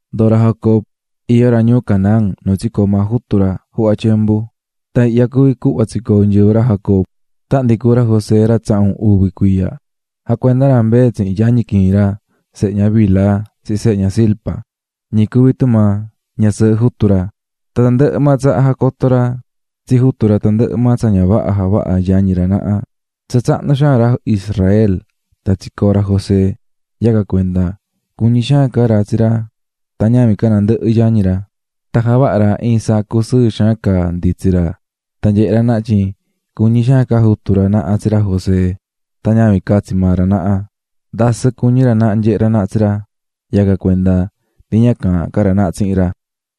Ndoo̱ ra Jacob iyó ra ñuu Canaán nu tsicoo̱ maa jutu ra juhva tyembu. Tan ihya cuví cuhva tsicoo̱ nyɨvɨ ra Jacob: Tahan ndi cuú ra José ra tsahun uvi cuiya, jacuendá ra mbee tsihin yañi quiin ra, sehe ña Bilha tsihin sehe ña Zilpa, ñi cuví tumaa ñasɨɨhɨ jutu ra, tan tandɨhɨ maa tsaha jacotó ra tsi jutu ra tandɨhɨ maa tsa ña vaha javahá yañi ra naha ra. Tsa tsahnu xaan ra Israel tan tsicoo̱ ra José yacan cuenda cuñí xaan ca ra tsi ra tan ñavin ca nandɨhɨ yañi ra, tan javaha̱ ra iin sacu sɨɨ xaan caá nditsí ra. Tsa nyehé ra naha tyin cuñí xaan ca jutu ra naha tsi ra José tan ñavin ca tsi maa ra naha, ndasɨ cuñí ra naha nyehé ra naha tsi ra, yacan cuenda ndi ña caahán ca ra naha tsihin ra.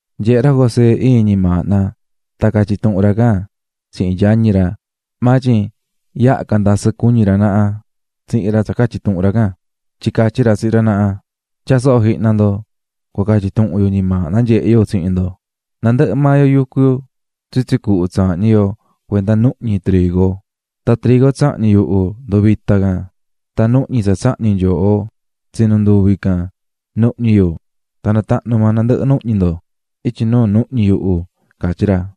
Nyehe̱ ra José iin ñimaahna tan catyi̱ tuhun ra can tsihin yañi ra. Maa tyin, yaha ca ndasɨ cuñi̱ ra naha tsihin ra tsa catyi̱ tuhun ra can. Tyin catyí ra tsihin ra naha: --Tya̱a soho jihna ndo cua catyi tuhun yu ñimaahna nyehe̱ yu tsihin ndo: Nandɨhɨ maa yo yucú tsitsi cuhu tsaahñí yo cuenda nuhñi trigo, tan trigo tsahñi̱ yuhu nduvita̱ can, tan nuhñi tsa tsahñi̱ nyooho, tsinunduvi̱ can nuhñi yu tan natahnu̱ tandɨhɨ maa nuhñi ndo ityi nuu nuhñi yuhu --catyí ra.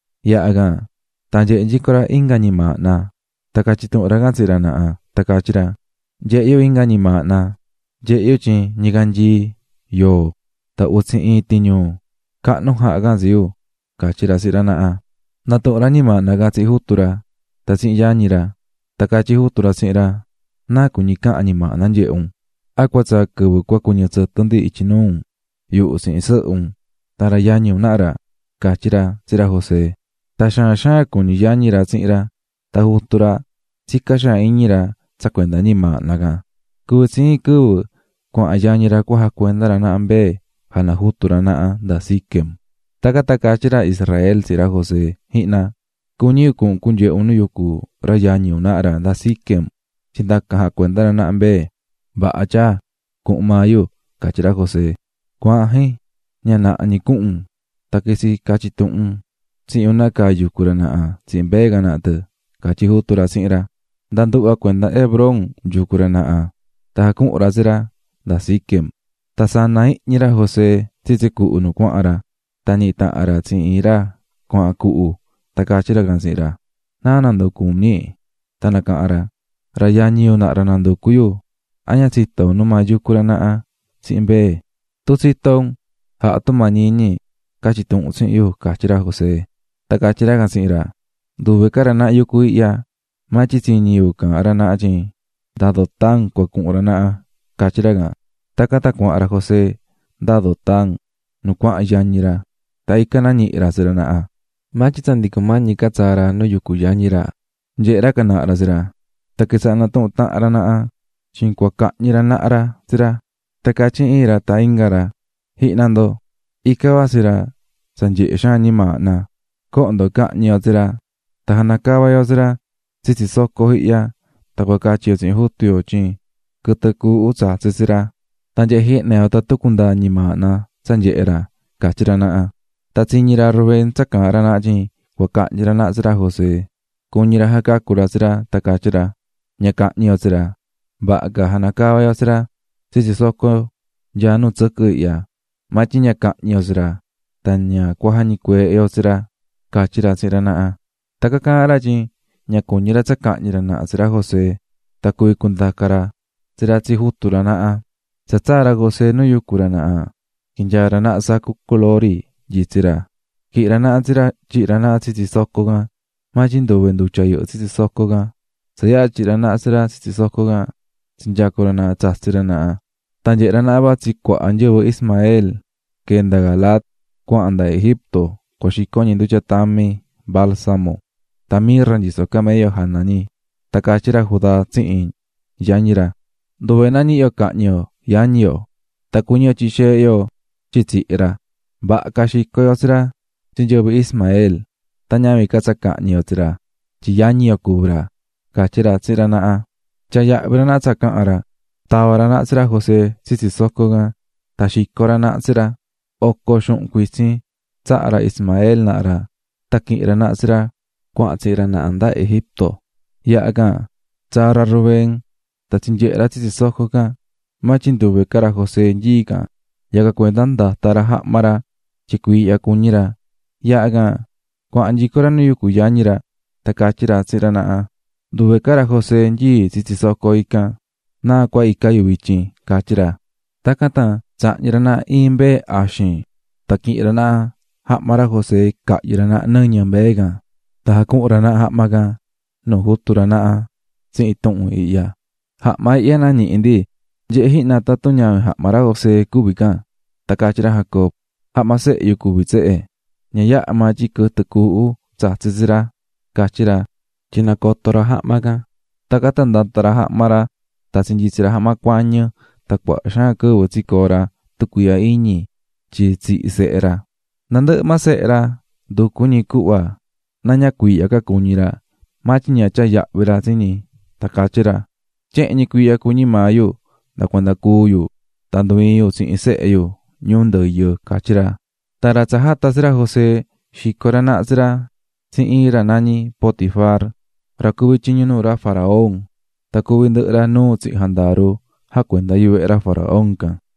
Yaha can tan nyehe̱ nyico ra inga ñimaahna tan catyi̱ tuhun ra can tsihin ra naha tan catyí ra: --Nyehe̱ yu inga ñimaahna, nyehe̱ yu tyin ñicanyii, yoo tan utsi iin tiñuu, cahnu jaha̱ can tsi yu --catyí ra tsihin ra naha. Natuhu̱n ra ñimaahna can tsihin jutu ra tan tsihin yañi ra. Tan catyí jutu ra tsihin ra: --¿Náa cuñí cahan ñimaahna nyehe̱ un? ¿A cua tsaa quɨvɨ cua cuɨñɨ tsɨtɨ ndi ityi nuu un, yuhu tsihin sɨhɨ un tan ra yañi un naha ra? --catyí ra tsihin ra José. Tan xaan xaan cuñí yañi ra tsihin ra, tan jutu ra naha tsicá xaan iñi ra tsa cuenda ñimaahna can. Cuvi̱ tsi iin quɨvɨ cuahan yañi ra cua jacuenda ra naha mbee jana jutu ra naha nda Siquem. Tacan tan catyí ra Israel tsihin ra José: --Ji̱hna, cuñí yu cuhun un cunyehe un nu yucú ra yañi un naha ra nda Siquem, tyin ndacan jacuendá ra naha mbee. --Vaha tyaa, cuhun maa yu --catyí ra José. --Cua̱ahan, jin, ña naha ñi cuhun un, tan quitsi catyi tuhun un tsihin yu nácaa yucú ra naha tsihin mbee can naha tɨ --catyí jutu ra tsihin ra. Nda nduhva cuenda Hebrón yucú ra naha tan jacuhu̱n ra tsi ra nda Siquem. Tan sana̱ jihñi ra José tsitsi cuhu nu cuahan ra, tan ñihi̱ tahan ra tsihin iin ra cuahan cuhu tan catyí ra can tsihin ra: --¿Naá nanducú un, ñi? Tan nacaha̱n ra: --Ra yañi yu naha ra nanducú yu, a ña tsitó un numaa yucú ra naha tsihin mbee, tun tsitó un ja̱ha tumañi iñi ca̱tyi tuhun tsihin yu --catyí ra José. Tan catyí ra can tsihin ra: --Nduve ca ra naha yucú ihya, maa tyin tsiñi̱ yu caahán ra naha tyin nda Dotán cua cuhun ra naha --catyí ra can. Tacan tan cuahan ra José nda Dotán nu cuahan yañi ra tan ican nañihi̱ ra tsi ra naha. Maa tyin tsa ndi cumañí ca tsaa ra nu yucú yañi ra, nyehe̱ ra can naha ra tsi ra, tan quitsaha̱ natuhún tahan ra naha tyin cua cahñi ra naha tsi ra. Tan catyí iin ra tan inga ra: --¡Ji̱hna ndo, ican vatsí ra tsa nyehe̱ xaan ñimaahna! Co̱hon ndo cahñi yo tsi ra, tan janacava yo tsi ra tsitsi soco ihya tan cua catyi yo tsihin jutu yo tyin quɨtɨ cuuhu tsatsi̱ tsi ra. Tan nyehe jihna yo tatun cundaa ñimaahna tsa nyehé ra --catyí ra naha. Tan tsiñi̱ ra Rubén tsa caahán ra naha tyin cua cahñi ra naha tsi ra José, cuñi̱ ra jacacu̱ ra tsi ra tan catyí ra: --Ña cahñi ñi yo tsi ra. Vaha ca janacava yo tsi ra tsitsi soco nyaá nu tsɨquɨ ihya, maa tyin ña cahñi yo tsi ra, tan ña cua jañicueehe yo tsi ra --catyí ra tsihin ra naha. Tacan caahán ra tyin ña cuñí ra tsa cahñi ra naha tsi ra José tan cuvi cundaca ra tsi ra tsi jutu ra naha. Tsa tsaa̱ ra José nu yucú ra naha, quinyaa̱ ra naha ra sacu culori nyitsí ra, quihi̱n ra naha tsi ra tyihi̱ ra naha tsitsi soco can, maa tyin nduve ndutya yɨhɨ́ tsitsi soco can. Tsa yaha tyihi̱ ra naha tsi ra tsitsi soco can, tsinyacu̱ ra naha tsatsí ra naha. Tan nyehe̱ ra naha vatsí cuaha nyɨvɨ Ismael quee̱ nda Galaad cuahan nda Egipto cua xico ñi ndutya tami, balsamo, tan mirra nyisó camello jana ñi. Tan catyí ra Judá tsihin yañi ra: --Nduve náa ñihi yo cahñi yo yañi yo, tan cuñí yo tyihi xeehe yo tyin tsihi̱ ra. Vaha ca xico yo tsi ra tsi nyɨvɨ Ismael, tan ñavin ca tsa cahñi yo tsi ra tyin yañi yo cuví ra --catyí ra tsihin ra naha. Tyaa̱ yahvi ra naha tsa caha̱n ra. Tava̱ ra naha tsi ra José tsitsi soco can tan xico̱ ra naha tsi ra. Oco xuhun cuitsin tsaha̱ ra Ismael naha ra tan quihi̱n ra naha tsi ra cuahan tsihin ra naha nda Egipto. (Ra ñuu Madián cuví ra naha.) Yaha can, tsaa̱ ra Rubén tan tsinyehe̱ ra tsitsi soco can, maa tyin nduve ca ra José nyií can, yacan cuenda ndata̱ ra jahma ra tyin cuiihya cuñí ra. Yaha can, cuahan nyico ra nu yucú yañi ra, tan catyí ra tsihin ra naha: --Nduve ca ra José nyii̱ tsitsi soco ican ¿Náa cua ica yu vityin? ―catyí ra. Tacan tan tsahñi̱ ra naha iin tan quihi̱n ra naha jahma ra José cahyɨ̱ ra naha nɨñɨ mbee can. Tan jacuhu̱n ra naha jahma can nuu jutu ra naha tsihin tuhun ihya: "Jahma ihya nañihi̱ ndi, nye̱he jihna tatun ñavin jahma ra José cuví can." Tan catyí ra Jacob: "Jahma sehe yu cuví tsehe, ña yaha maa tyin quɨtɨ cuuhu tsatsi̱ tsi ra", catyí ra tyin nacoto̱ ra jahma can. Tacan tan ndata̱ ra jahma ra, tan tsinyitsi̱ ra jahma cuañɨ tan cuaha xaan quɨvɨ tsicoo̱ ra tucuiihya iñi tyin tsihi̱ sehe ra. Nandɨhɨ maa sehe ra, nducu̱ ñi cuhva na ña cuiihya ca cuñí ra, maa tyin ña tyaa̱ yahvi ra tsi ñi, tan catyí ra: "¡Tyehen ñi cuiihya cuñí maa yu nda cuanda cúu yu tan ndu iin yu tsihin sehe yu ñuu ndɨyɨ!" catyí ra. Tan ra tsa jata̱ tsi ra José, xico̱ ra naha tsi ra tsi iin ra nañí Potifar ra cuví tyiñu nuu ra faraón, tan cuví ndɨhɨ ra nuu tsihin jandaru jacuendá vehe ra faraón can.